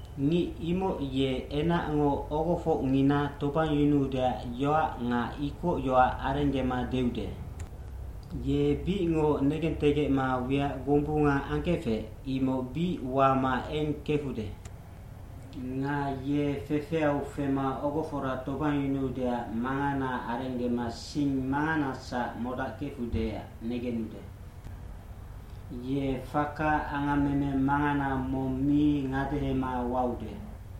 Ngic imoc ye enacngo ogofocngina tobangyunuudeac yoac nga ikocyoac arenggema deude. Ye bicngoc negentegecma wiac gombunga angkefec, imoc bic wama eng kefude. Nga ye fefeau fema ogofora tobangyunuudeac mangana arenggema sing manganasac modackefudeac negenude. Ye faka angammeme mangana mong mi ngadehema waude.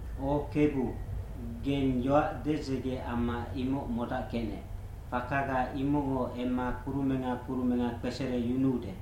O Kebu, geng yoac dedzege amma imoc modackecnec, fakaga imocngo emma kurumenga kurumenga kpesereyunuude.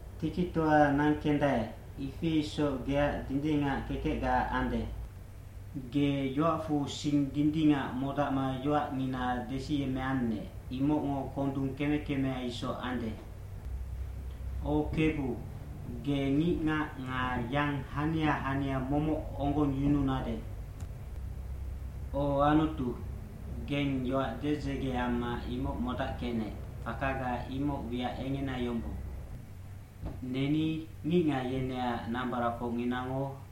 Tikitoa nangkendae, ifi isoc geac dindingac kekecga ande. Ge yoacfu sing dindingac modacma yoacngina desiyemmeannec, imocngo kondung keme kemea isoc ande. O Kebu, ge ngicngac nga yang hania hania momoc onggongyununade. O Anutu, geng yoac dedzege amma imoc modackecnec, fakaga imoc wiac engena yombong. Neni, ngicngac yeneac nambaracfocnginango,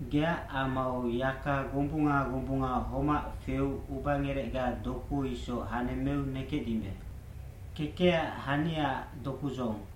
Geac amau yaka gombunga gombunga homac feu ubangerecga doku isoc hanemmeu nekecdimbe.d Kekecac haniaac dokudzohong,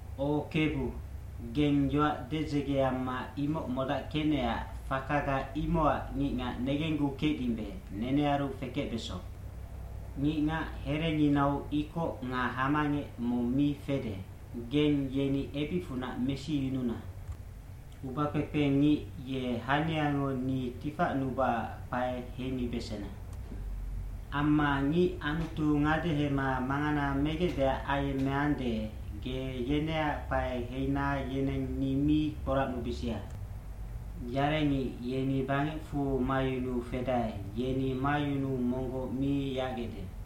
O Kebu, geng yoac dedzege amma imoc modackecnecac fakaga imocac ngicngac negenggukecdimbe, nenearu fekecbeso. Ngicngac herenginau ikoc nga hamangec mong mi fede, geng yeni ebicfunac mesiyununa. Ubakpekpe ngic ye haniango ni tifacnubaac kpae heimibesena. Amma ngic Anutu ngadehema mangana megecdeac ayemmeande, ge yeneac kpae heina yeneng ni mi kporacnubisia. Yarengic yeni bangecfu mayunuu fedae, yeni mayunuu monggoc mi yacgecde.